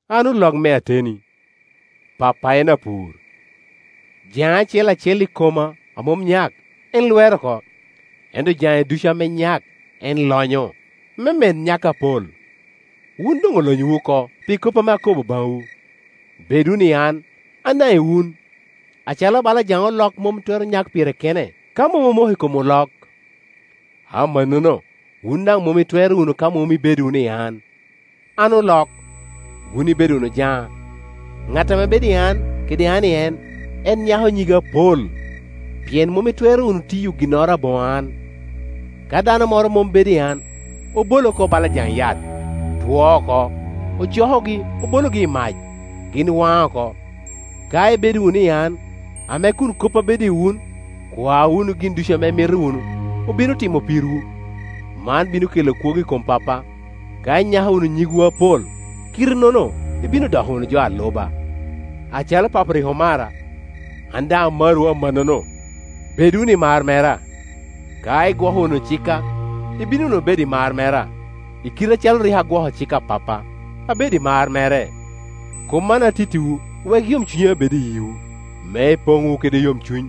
“An olok me ateni, Pappa en apur. Jaŋe acel acel i koma a mom nyak, en lwero oko; ento jaŋe ducu ame nyak en lonyo, me med nyak apol. Wun doŋ olonyowu oko pi kop ame akobo baŋwu. Bed wunu i an, an daŋ i wun. Acalo bala jaŋ olok mom twero nyak pire kene, ka mom omoko i kom olok, amannono, wun daŋ mom itwero wunu ka mom ibedo wunu i an. An olok, wun ibedo wunu jana. Ŋat ame bedo i an, kede an i en, en nyako nyige apol, pien mom itwero wunu tiyo ginnoro aboŋo an. Ka dano moro mom bedo i an, obole oko bala jaŋ yat, two oko; ocokogi, obologi i mac, gin waŋ oko. Ka ibedo wunu i an, ame kun koppa bedo i wun, kwa wunu gin ducu ame imito wunu, obino timo pirwu. Man bino kela kwogo i kom Pappa, ka inyako wunu nyigwu apol; kite-nono, ibino doko wunu jo a luba. Acalo Papo rik omara, an daŋ amarowu amannono; bed wunu i mar mera. Ka igwoko wunu cikka, ibino wunu bedo i mar mera, i kite acalo rik an agwoko cik a Pappa, abedo i mar mere. Kop man atittiwu wek yomcunya bed i yiwu, me ipoŋ wunu kede yomcuny.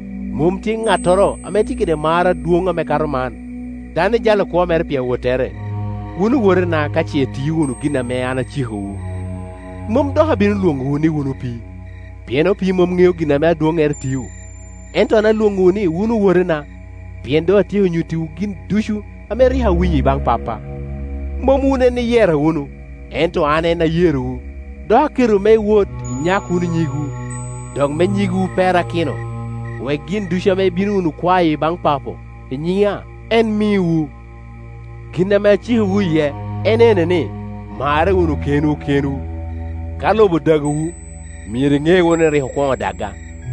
Mom tye ŋattoro ame tye kede mar adwoŋ ame kato man, dano ijalo kwo mere pi awottere. Wun owotena ka ce itio wunu gin ame an acikowu. Mom dok abino lwoŋowu ni wun opii, pien opii mom ŋeo gin ame adwoijnere tio; ento an alwoŋowu ni wun owotena, pien doŋ atyeko nyuttiwu gin ducu ame rik awinyo i baŋ Pappa. Mom wun en iyera wunu, ento an en ayerowu, dok aketowu me iwot, inyak wunu nyigwu, dok me nyigwu perakino, wek gin ducu ame ibino wunu kwayo i baŋ Papo i nyina, en miwu. Gin ame acikowu iye en ene ni, marre wunu kenwu kenwu. “Ka lobo odagowu, myero iŋe wunu ni rik okwoŋo daga,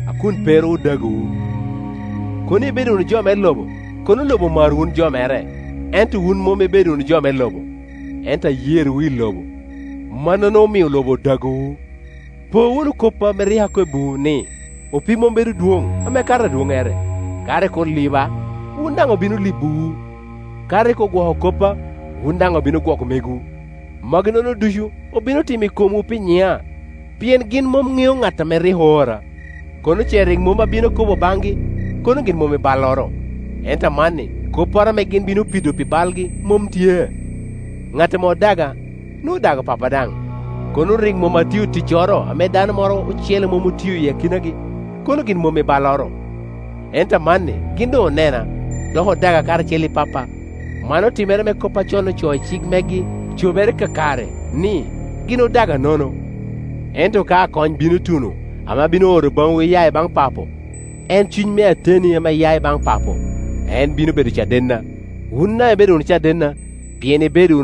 a kun pe ru odagowu. Kono ibedo wunu jo me lobo, kono lobo omaro wun jo mere; ento wun mom ibedo wunu jo me lobo, ento ayerowu i lobo, mannono omio lobo odagowu. Po wunu kop a rik akobbiwu, ni, ‘Opii mom bedo dwoŋ ame kato adwoŋŋere.’ Ka rik oliba, wun daŋ obino libowu; ka rik ogwoko koppa, wun daŋ obino gwoko megwu. Magi-nono ducu obino timo i komwu pi nyina, pien gin mom ŋeo ŋat ame rik oora. Kono ce rik mom abino akobo baŋgi, kono gin mom i balloro; ento amanni kopporo ame gin bino pido pi balgi mom tye. Ŋat ame odaga, nwoŋo odago Pappa daŋ. Kono rik mom atio ticcoro ame dano moro ocele mom otio i akinagi, kono gin mom i balloro; ento amanni gin doŋ onena, dok odaga, karacel i Pappa. Man otimere me kop a con ocoo i cik megi cobere kakare ni, ‘Gin odaga nono.’ Ento ka Akony bino tuno, ame abino oro baŋwu iiya i baŋ Papo, en Cuny me ateni ame ya i baŋ Papo, en bino bedo cadenna. Wun daŋ ibedo wunu cadenna, pien